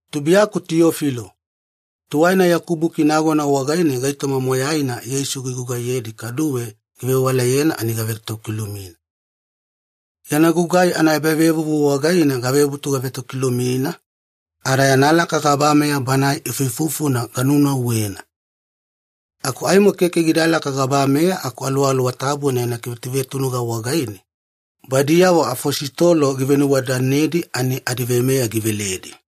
Tubuiyaku Tiyofilo, tuwaina yaku buki nagona wagaine gaitoma moyaina Yeisu gigugaiyedi kaduwe givewalayena ani gavetokilumina. Yana gugai anaebavevuvu wagaine gavebutu gavetokilumina, ada yana laka gabameya Banae ifuifufuna ganunauwena. Aku aimo keke gidalaka gabameya aku Aluwaluwa Tabuna yana kivetuvetunuga wagaine, badiyavo afositolo givenuwadadanedi ani adiveimeya giveledi.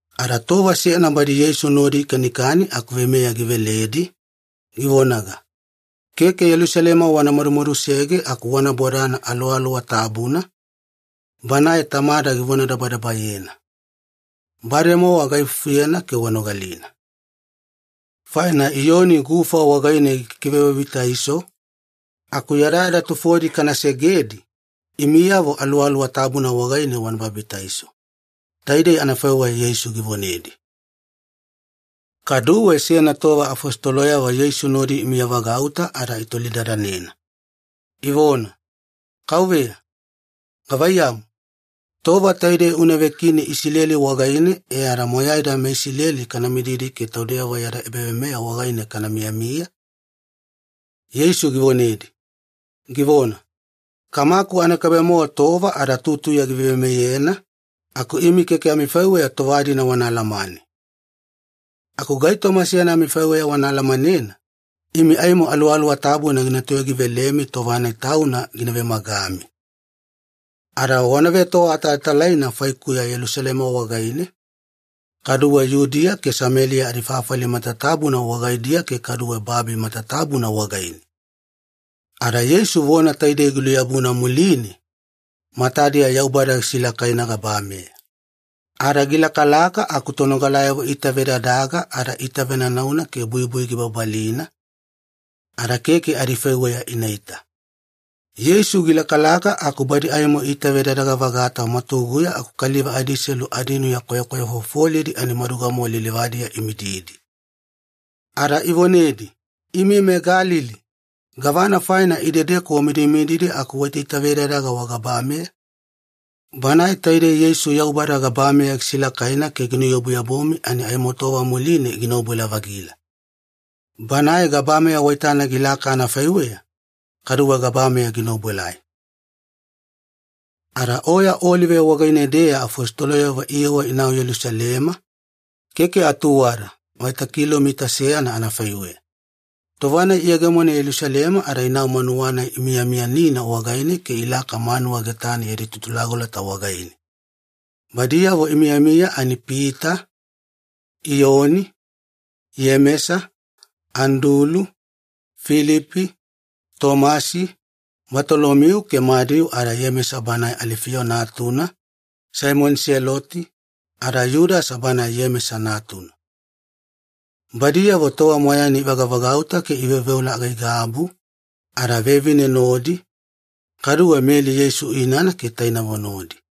Ada tova seyana badi Yeisu nodi ikanikani aku veimeya giveledi, givonaga, “Keke Yelusalema wana madumadusege aku wana bodana Aluwaluwa Tabuna, Banae Tamada givonadabadabayena. Bademowa gaifufuyena ke wanogalina. Faina Iyoni gufa wagaine gikikivebabitaiso, aku yadayada tufodi kana segedi, imiyavo Aluwaluwa Tabuna wagaine wana babitaiso.” Taidei anafaiweya Yeisu givonedi. Kaduwe seyana tova afositoloyavo Yeisu nodi imiyavagauta ada itolidadanena, ivona, “Kauveya, gavaiyamu, tova taidei una vekini Isileli wagaine e ada moyaida meIsileli kana mididi ke taudeyavo yada ebaveimeya wagaine kana miyamiya?” Yeisu givonedi, givona, “Kamaku anakaibe-mowa tova ada tutuya giveimeyena, aku imi keke amifaiweya tova-dina wana alamane. Aku gaitoma seyana amifaiweya wana alamanena, imi aimo Aluwaluwa Tabuna gina toyogivelemi tova-nai tauna gina vemagami. Ada wana vetoawatalatalaina faikuya Yelusalema wagaine, kaduwe Yudiya ke Sameliya adifafali matatabuna wagaidiya ke kaduwe babi matatabuna wagaine.” Ada Yeisu vona taidei giluyabuna muline, matadiya Yaubada gisilakaina gabameya. Ada gilakalaka aku tonogalayavo iitavedadaga ada iitavenanauna ke buibui gibabalina, ada keke adifaiweya inaita. Yeisu gilakalaka aku badi aimo iitavedadaga-vagata mwatuguya aku kaliva adiselu adinuya kwayakwayafofolidi ani maduga-mowa lilivadiya imididi. Ada ivonedi, “Imi meGalili, gavana faina idedeku wamidimididi aku waitaitavedadaga wagabameya? Banae taidei Yeisu Yaubada gabameya gisilakaina ke ginuyabuyabumi ani aimo tova muline gina obuelai-vagila. Banae gabameya waitana gilaka anafaiweya, kaduwe gabameya gina obuelai.” Ada Oya Olive wagaine-deya afositoloyavo iyewa inau Yelusalema, keke atuwada, vaita kilomita seyana anafaiweya. Tova-nai iyegemona Yelusalema ada inau manuwa-nai imiyamiyanina wagaine ke ilaka manuwa getane yadi tutulagolota wagaine. Badiyavo imiyamiya ani Pita, Iyoni, Iyemesa, Andulu, Filipi, Tomasi, Batolomiu ke Madiu ada Iyemesa banae Alifiyo natuna, Saimoni Seloti, ada Yudasa banae Iyemesa natuna. Badiyavo tova moyaina ivagavagauta ke iveoveola aigaigabu, ada vevine nodi, kaduwe Meli Yeisu inana ke tainavo nodi.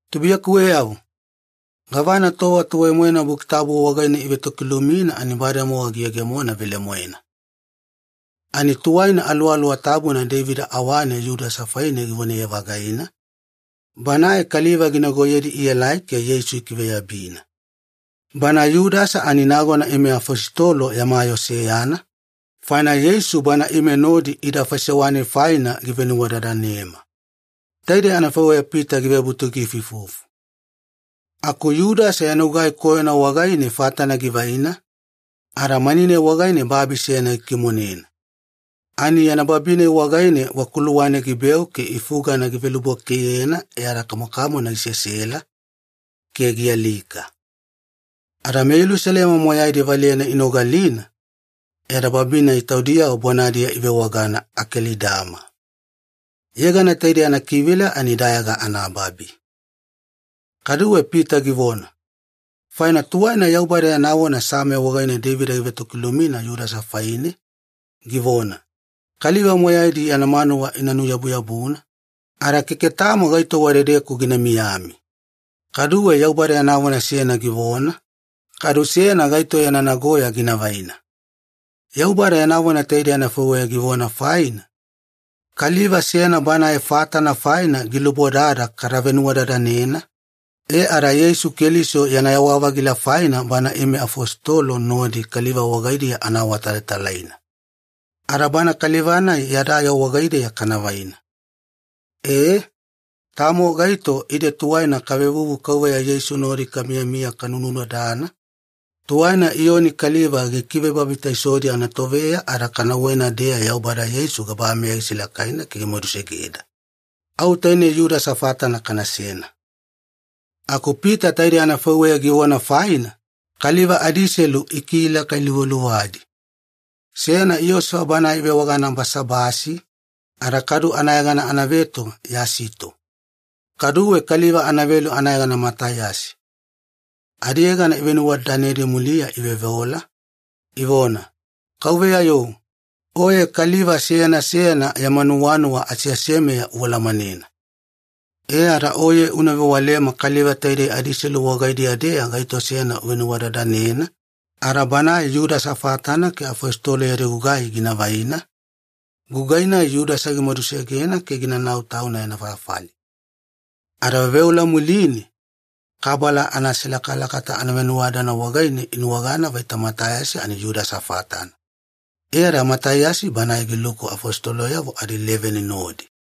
“Tubuiyakuweyavo, gavana tova tuwai-moena Buki Tabu wagaine ivetokilumina ani bademowa giyegemona velemoena. Ani tuwaina Aluwaluwa Tabuna Deivida awane Yudasa faine givonaye-vagaina, banae kaliva ginagoyedi ielai ke Yeisu ikiveyabina. Bana Yudasa ani nagona ime afositolo yama yoo seyana, faina Yeisu bana ime nodi ida faisewa-nai faina givenuwadadanema.” Taidei anafaiweya Pita givebutu giifuifufu. Aku Yudasa yana gugai koyona wagaine fatana givaina, ada mani-nai wagaine babi seyana gikimonena. Ani yana babi-nai wagaine wakuluwane gibeu ke ifugana givelubwakeiyena ada kamokamona gisesela, ke gialika. Ada meYelusalema moyaidi valeyana inogalina, e ada babi-nai taudiyavo bonadiya ivewagana ‘Akelidama’. Yegana taidei anakivila ani ‘Dayaga anaBabi’. Kaduwe Pita givona, “Faina tuwaina Yaubada yana vona Same wagaine Deivida givetokilumina Yudasa faine, givona, ‘Kaliva moyaidi yana manuwa ina nuyabuyabuna, ada keke tamo gaito wadedeku gina miyami.’ Kaduwe Yaubada yana vona seyana givona, ‘Kadu seyana gaito yana nagoya gina vaina.’ Yaubada yana vona taidei anafaiweya givona faina, kaliva seyana banae fatana faina gilubodada kada venuwadadanena, e ada Yeisu Keliso yana yawa-vagila faina bana ime afositolo nodi kaliva wagaidiya ana awatalatalaina. Ada bana kaliva-nai yada yoo wagaideya kana vaina. E, tamo gaito ide tuwaina kavevuvu Kauveya Yeisu nodi kamiyamiya kanunudadana, tuwaina Iyoni kaliva gikivebabitaisodi anatoveya ada kanauwena-deya Yaubada Yeisu gabameya gisilakaina ke gimadusegeda. Au tainei Yudasa fatana kanasena.” Aku Pita taidei anafaiweya givona faina, kaliva adiselu ikilakailuvaluvadi. Seyana Iyosefa banae ivewagana Basabasi, ada kadu anayegana anaveto Yasito. Kaduwe kaliva anavelu anayegana Mataiyasi. Adiyegana ivenuwadadanedi muliya iveoveola, ivona, “Kauveya-yo, Oye kaliva seyana seyana yama nuwanuwa aseasemeya ualamanena. E ada Oye una vewalema kaliva taidei adiselu wagaidiya-deya gaito seyana uvenuwadadanena, ada banae Yudasa fatana ke afositolo yadi gugai gina vaina, gugai-nai Yudasa gimadusegena ke ginanau tauna yana fafali.” Ada veoveola muline, kabala anaselakalakata anavenuwadadana wagaine inuwagana vaita Mataiyasi ani Yudasa fatana. E ada Mataiyasi banae giluku afositoloyavo adileveni nodi.